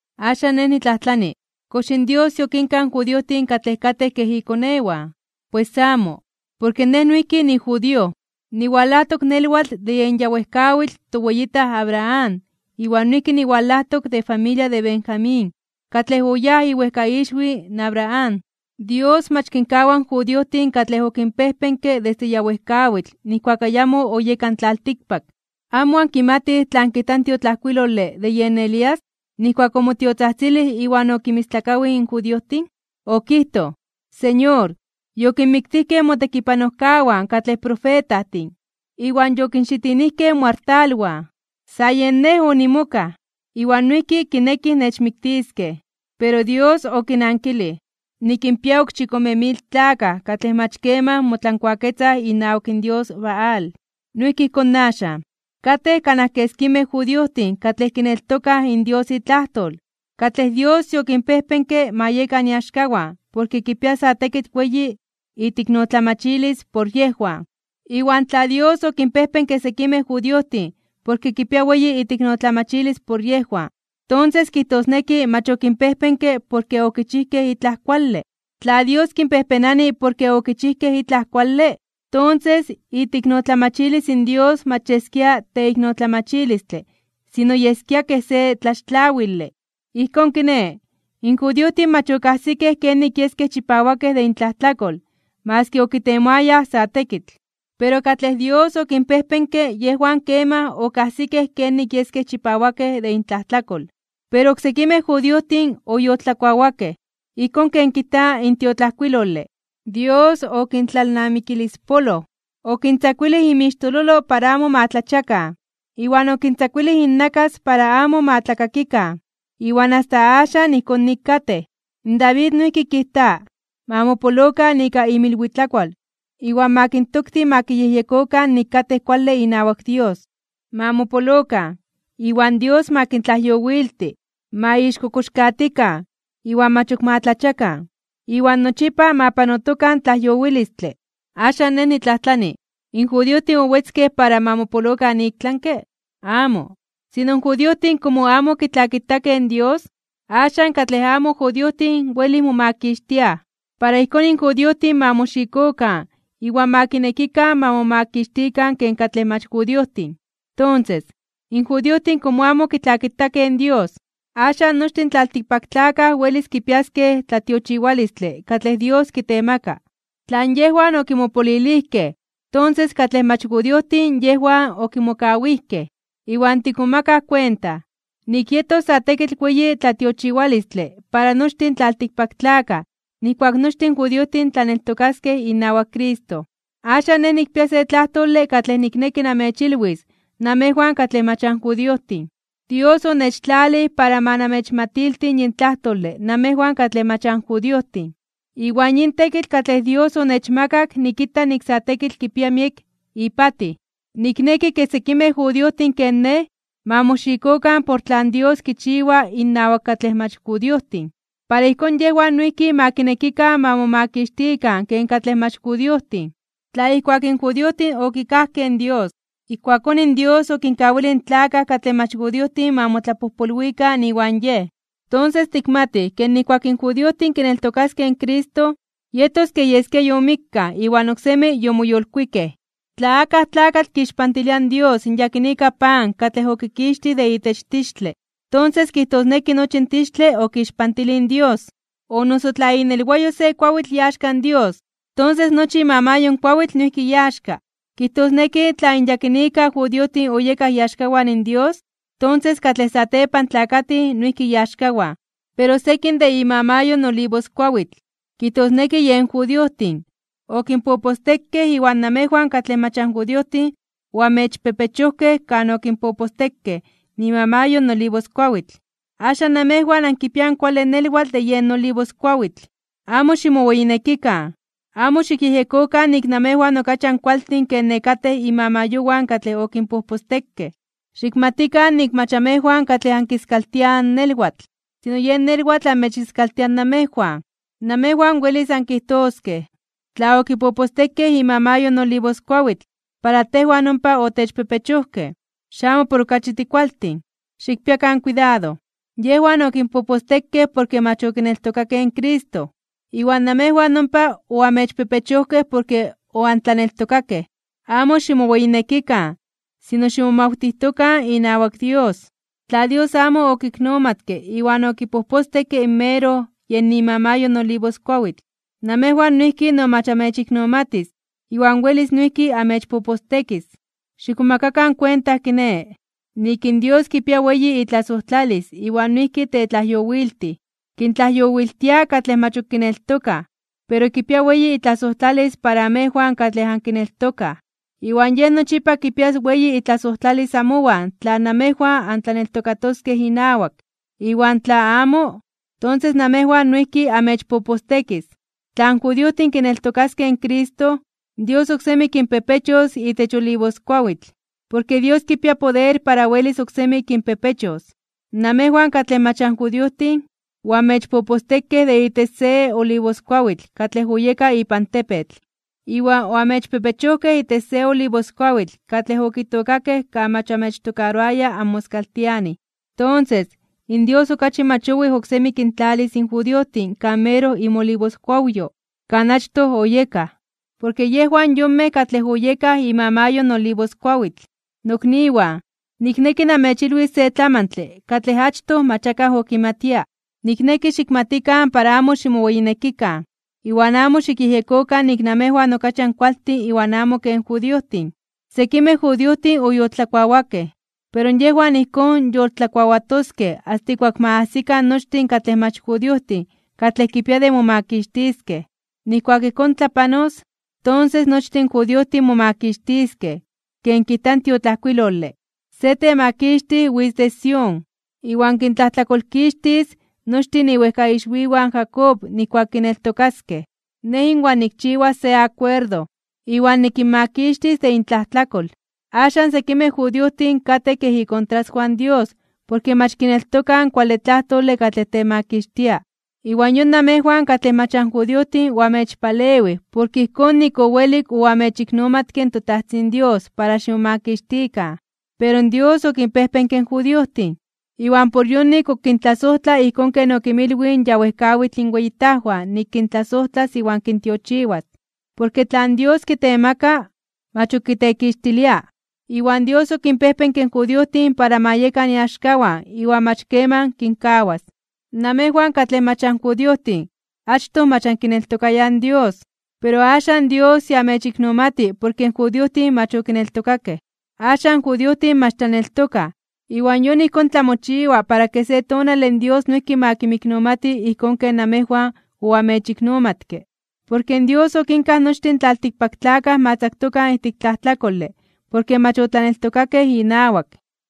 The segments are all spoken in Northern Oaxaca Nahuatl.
Axan nej nitlajtlani: ¿Kox in Dios yokinkaj in judiojtin katlej katej kej ikonewan? ¡Pues amo! Porke nej noijki nijudío. Niwalajtok nelwatl de yen ya wejkawitl toweyitaj Abraham iwan noijki niwalajtok de familia de Benjamín katlej oyáj iwejkaixwi in Abraham. Dios mach kinkawa in judiojtin katlej okinpejpenke desde ya wejkawitl nijkuak ayamo oyeka in tlaltikpak. ¿Amo ankimatij tlan kijta in tiotlajkuilole de yen Elías, nijkuak omotiotzajtzilij iwan okinmistlakawij in judiojtin? Okijtoj: “Señor, yokinmiktijkej motekipanojkawan katlej profetajtin, iwan yokinxitinijkej moartalwan. Sa yen nej onimokaj, iwan noijki kinekij nechmiktiskej.” Pero Dios okinankilij: “Nikinpia ok chikome mil tlakaj katlej mach keman motlankuaketzaj inawak in dios Baal.” Noijki ijkón axan. Katej kanaj keskimej judiojtin katlej kineltokaj in Dios itlajtol, katlej Dios yokinpejpenke ma yekan iaxkawan porke kipia sa tekitl weyi iteiknotlamachilis por yejwan. Iwan tla Dios okinpejpenke sekimej judiojtin porke kipia weyi iteiknotlamachilis por yejwan, tonses kijtosneki mach okinpejpenke porke okichijkej itlaj kuale. Tla Dios kinpejpenani porke okichijkej itlaj kuale, tonses iteiknotlamachilis in Dios mach yeskia teiknotlamachilistle sino yeskia kej se tlaxtlawile. Ijkón kiné, in judiojtin mach okajsikej kenik yeskej chipawakej de intlajtlakol maski okitemoayaj sa tekitl. Pero katlej Dios okinpejpenke yejwan kemaj okajsikej kenik yeskej chipawakej de intlajtlakol. Pero oksekimej judiojtin oyoltlakuawakej. Ijkón ken kijta in tiotlajkuilole: “Dios okintlalnamikilispoloj. Okintzakuilij inmixtololo para amo ma tlachiakan, iwan okintzakuilij innakas para amo ma tlakakikan, iwan asta axan ijkón nik katej.” In David noijki kijta: Ma mopolokan ika inmilwitlakual iwan ma kintokti ma kiyejyekokan nik katej kuale inawak Dios. Ma mopolokan, iwan Dios ma kintlajyowilti. Ma ixkokoxkatikan (ixpachitikan) iwan mach ok ma tlachiakan, iwan nochipa ma panotokan tlajyowilistle. Axan nej nitlajtlani: ¿In judiojtin owetzkej para ma mopolokan iktlanke (ik tlami)? ¡Amo! Sino in judiojtin komo amo okitlakitakej in Dios, axan katlej amo judiojtin welij momakixtiaj. Para ijkón in judiojtin ma moxikokan iwan ma kinekikan ma momakixtikan ken katlej mach judiojtin. Tonses, in judiojtin komo amo okitlakitakej in Dios, axan nochtin in tlaltikpaktlakaj welis kipiaskej tlatiochiwalistle katlej Dios kitemaka. Tlan yejwan okimopolilijkej, tonses katlej mach judiojtin yejwan okimokawijkej. Iwan tikmomakaj kuenta, nik yetos sa tekitl weyi tlatiochiwalistle para nochtin tlaltikpaktlakaj nijkuak nochtin in judiojtin tlaneltokaskej inawak Cristo. Axan, nej nikpia se tlajtole katlej nikneki namechilwis namejwan katlej mach anjudiojtin. Dios onechtlalij para ma namechmatilti yin tlajtole namejwan katlej mach anjudiojtin. Iwan yin tekitl katlej Dios onechmakak nikita nik sa tekitl kipia miek ipatij. Nikneki ke sekimej judiojtin ken nej, ma moxikokan por tlan Dios kichiwa innawak katlej mach judiojtin. Para ijkón yejwan noijki ma kinekikan ma momakixtikan ken katlej mach judiojtin. Tla ijkuak in judiojtin okikajkej in Dios, ijkuakón in Dios okinkawilij in tlakaj katlej mach judiojtin ma motlapojpolwikan iwan Yej, tonses tikmatij ke nijkuak in judiojtin kineltokaskej in Cristo, yetos kej yeskia yomikkaj iwan oksemi yomoyolkuikej. Tla akaj tlakatl kixpantilia in Dios in yakinika pan katlej okikixtij de itech tixtle, tonses, kijtosneki nochi in tixtle okixpantilij in Dios. O noso tla inelwayo se kuawitl iaxka in Dios, tonses nochi imamayo in kuawitl noijki iaxka. Kijtosneki tla in yakinika judiojtin oyekaj iaxkawan Dios, tonses, katlej satepan tlakatij noijki iaxkawan. Pero sekin de imamayo in olivoskuawitl, kijtosneki yen judiojtin, okinpopostekej iwan namejwan katlej mach anjudiojtin oamechpepechojkej kan okinpopostekej imamayo in olivoskuawitl. Axan namejwan ankipiaj in kuale nelwatl de yen olivoskuawitl. Amo ximoweyinekikan. Amo xikyejyekokan nik namejwan okachi ankualtin ke nekatej imamayowan katlej okinpopostekej. Xikmatikan nik mach amejwan katlej ankiskaltiaj in nelwatl, sino yen nelwatl amechiskaltia namejwan. Namejwan welis ankijtoskej: “Tla okinpopostekej imamayo in olivoskuawitl para tejwan ompa otechpepechojkej, xamo por okachi tikualtin.” ¡Xikpiakan kuidado! Yejwan okinpopostekej porke mach okineltokakej in Cristo. Iwan namejwan ompa oamechpepechojkej porke oantlaneltokakej. Amo ximoweyinekikan, sino ximomawtijtokan inawak Dios. Tla Dios amo okinmiknomatke iwan okipopostekke in meroj yen imamayo in olivoskuawitl, namejwan noijki no mach amechiknomatis iwan welis noijki amechpopostekis. Xikmomakakan kuenta kiné, nik in Dios kipia weyi itlasojtlalis iwan noijki tetlajyowiltij. Kintlajyowiltia katlej mach ok kineltokaj, pero kipia weyi itlasojtlalis para amejwan katlej ankineltokaj. Iwan Yej nochipa kipias weyi itlasojtlalis amowan tla namejwan antlaneltokatoskej inawak. Iwan tla amo, tonses namejwan noijki amechpopostekis. Tla in judiojtin kineltokaskej in Cristo, Dios oksemi kinpepechos itech olivoskuawitl. Porke Dios kipia poder para welis oksemi kinpepechos. Namejwan, katlej mach anjudiojtin, oamechpopostekej de itech se olivoskuawitl katlej oyeka ipan tepetl, iwan oamechpepechojkej itech se olivoskuawitl katlej okitookakej kan mach oamechtokaroaya anmoskaltianij. Tonses, in Dios okachi mach owij oksemi kintlalis in judiojtin kan meroj inmolivoskuawyo kan achtoj oyekaj, porke yejwan yonmej katlej oyekaj imamayo in olivoskuawitl. Nokniwan, nikneki namechilwis se tlamantle katlej achtoj mach akaj okimatia. Nikneki xikmatikan para amo ximoweyinekikan, iwan amo xikyejyekokan nik namejwan okachi ankualtin iwan amo ken judiojtin. Sekimej judiojtin oyoltlakuawakej, pero yejwan ijkón yoltlakuawatoskej asta ijkuak ma ajsikan nochtin katlej mach judiojtin katlej kipia de momakixtiskej. Nijkuak ijkón tlapanos, tonses nochtin in judiojtin momakixtiskej. Ken kijta in tiotlajkuilole: Se Temakixtij witz de Sión, iwan kintlajtlakolkixtis nochtin iwejkaixwiwan in Jacob nijkuak kineltokaskej. Nej inwan nikchiwas se akuerdo, iwan nikinmakixtis de intlajtlakol. Axan sekimej judiojtin katej kej ikontraswan in Dios porke mach kineltokaj in kuale tlajtole katlej temakixtia, iwan yon namejwan katlej mach anjudiojtin oamechpalewij porke ijkón nik owelik oamechiknomatke in toTajtzin Dios para ximomakixtikan. Pero Dios okinpejpenke in judiojtin, iwan por yonik ok kintlasojtla ijkón ken okinmilwij in ya wejkawitl inweyitajwan nik kintlasojtlas iwan kintiochiwas. Porke tlan Dios kitemaka, mach ok kitekixtilia. Iwan Dios okinpejpenke in judiojtin para ma yekan iaxkawan iwan mach keman kinkawas. Namejwan katlej mach anjudiojtin achtoj mach ankineltokayaj in Dios, pero axan Dios ya amechiknomati porke in judiojtin mach okineltokakej. Axan in judiojtin mach tlaneltokaj, iwan yon ijkón tlamochiwa para ke se tonale in Dios noijki ma kinmiknomati ijkón ken namejwan oamechiknomatke. Porke Dios okinkaj nochtin tlaltikpaktlakaj ma tzaktokan ijtik tlajtlakole porke mach otlaneltokakej inawak,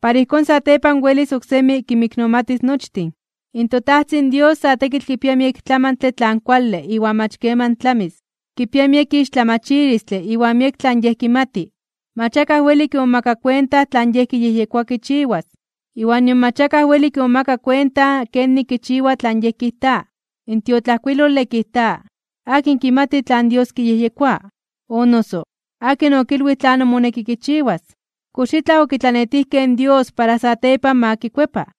para ijkón satepan welis oksemi kinmiknomatis nochtin. ¡In toTajtzin Dios sa tekitl kipia miek tlamantle tlan kuale iwan mach keman tlamis! ¡Kipia miek ixtlamachilistle iwan miek tlan Yej kimati! Mach akaj weli kimomaka kuenta tlan Yej kiyejyekoa kichiwas, iwan nion mach akaj weli kimomaka kuenta kenik kichiwa tlan Yej kijta. In tiotlajkuilole kijta: “¿Akin kimati tlan Dios kiyejyekoa? O noso, ¿akin okilwij tlanon moneki kichiwas? ¿Kox itlaj okitlanetijkej in Dios para satepan ma kikuepa?”